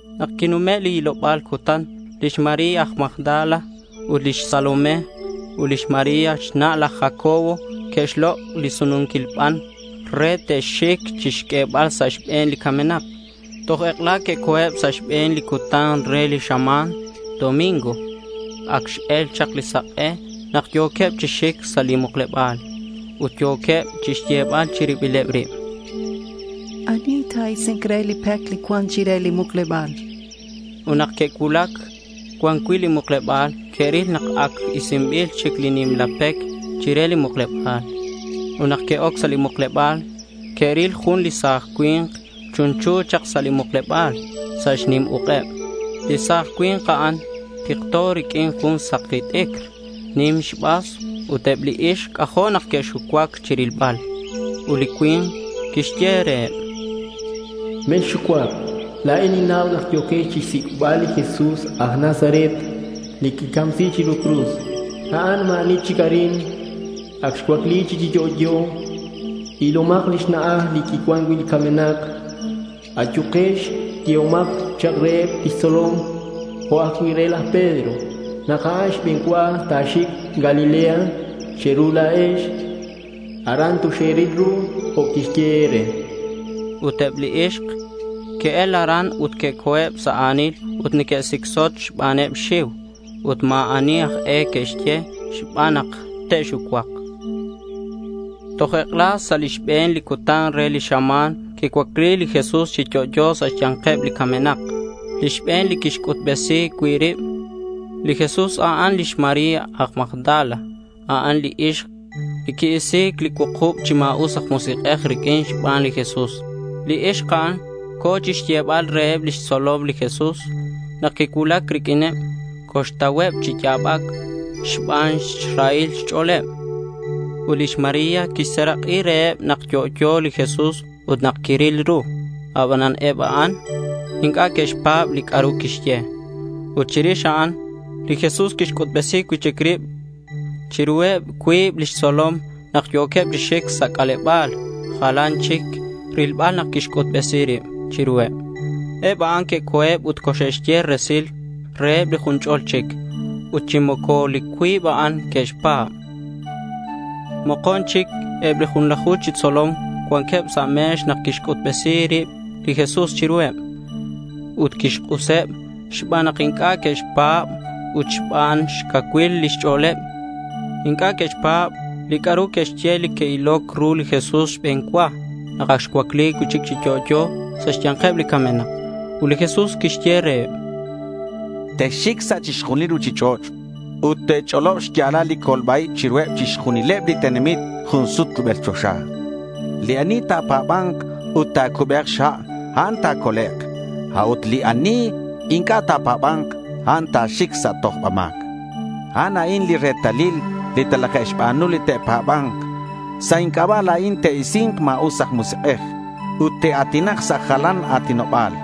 Nak quinume' li hiloba̱l cutan, lix María aj Magdala ut lix Salomé ut lix María xna' laj Jacobo que'xlok' li sununquil ban re te'xic chixq'uebal sa' xbe̱n li camenak. Toj ek'ela que'co̱eb sa' li xbe̱n li cutan re li xama̱n. Ac x-el chak li sak'e nak yo̱queb chi xic sa' li mukleba̱l. Ut yo̱queb chixyebal chi ribileb rib: —¿Ani ta̱isi̱nk re li pec li cuan chire li mukleba̱l? chanqueb. Ut nak que'cuulac cuan cui' li mukleba̱l, que'ril nak ac isinbil chic li nimla pec chire li mukleba̱l. Ut nak que'oc sa' li mukleba̱l que'ril jun li sa̱j cui̱nk chunchu chak sa' li mukleba̱l sa' xnim uk'eb. Li sa̱j cui̱nk a'an tikto riq'uin jun saki t'icr nim xbas ut eb li ixk c'ajo' nak que'xucuac chirilbal. Ut li cui̱nk quixye reheb: —Mexxucuac. La̱in ninnau nak yo̱quex chixsic'bal li Jesús aj Nazaret li que'xcamsi chiru cruz. A'an ma̱ ani chic arin. Ac xcuacli cui'chic chi yo'yo. Ilomak lix na'aj li xcuan cui' li camenak. Ayukex, yehomak chak reheb lix tzolom, jo' ajcui' re laj Pedro, nak a'an xbe̱n cua ta̱xic Galilea che̱ru la̱ex. Aran toxe̱ril ru jo' quixye e̱re, chan. Ut eb li ixk que'el aran ut que'co̱eb sa' a̱nil ut neque'sicsot xbaneb xxiu. Ut ma̱ ani aj e que'xye xban nak te'xucuak. Toj ek'ela sa' li xbe̱n li cutan re li xama̱n quicuacli li Jesús chi yo'yo sa' xya̱nkeb li camenak. Li xbe̱n li quixc'utbesi cui' rib li Jesús, a'an lix María aj Magdala. A'an li ixk li qui-isi̱c li cuukub chi ma̱us aj musik'ej riq'uin xban li Jesús. Li ixk a'an co̱ chixyebal reheb lix tzolom li Jesús. Nak quicuulac riq'uineb, coxtauheb chi ya̱bac xban xrahil xch'o̱leb. Ut lix María quixserak'i reheb nak yo'yo li Jesús ut nak quiril ru. Abanan eb a'an inc'a' que'xpa̱b li c'a'ru quixye. Ut chirix a'an, li Jesús quixc'utbesi cui'chic rib chiruheb cuib lix tzolom nak yo̱queb chi xic sa' c'aleba̱l. Jalan chic rilbal nak quixc'utbesi rib chiruheb. Eb a'an que'co̱eb ut coxe'xye resil reheb li jun ch'ol chic. Ut chi moco li cuib a'an que'xpa̱b. Mokon chic eb li junlaju chi xtzolom cuanqueb sa' me̱x nak quixc'utbesi rib li Jesús chiruheb. Ut quixk'useb xban nak inc'a' que'pa̱ban ut xban xcacuil lix ch'o̱leb. Inc'a' que'xpa̱b li c'a'ru que'xye li que'iloc ru li Jesús xbe̱n cua nak ac xcuacli cui'chic chi yo'yo sa' xya̱nkeb li camenak. Ut li Jesús quixye reheb: —Texxic sa' chixjunil li ruchich'och' ut te̱ch'olob xya̱lal li colba-ib chiruheb chixjunileb li tenamit jun sut rubel choxa. Li ani ta̱pa̱ba̱nk ut ta̱cube̱k xha', a'an ta̱colek'; a'ut li ani inc'a' ta̱pa̱ba̱nk, a'an ta̱xic sa' tojba ma̱c. A'an a'in li retalil li talaje'xba̱nu li te'pa̱ba̱nk. Sa' inc'aba' la̱in te'isi̱nk ma̱us aj musik'ej ut te'a̱tinak sa' jalan a̱tinoba̱l.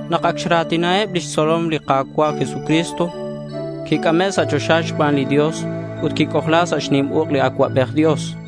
Nak ac xra̱tinaheb lix tzolom li Ka̱cua' Jesucristo, quic'ame' sa' choxa xban li Dios, ut quic'ojla sa' xnim uk' li Acuabej Dios.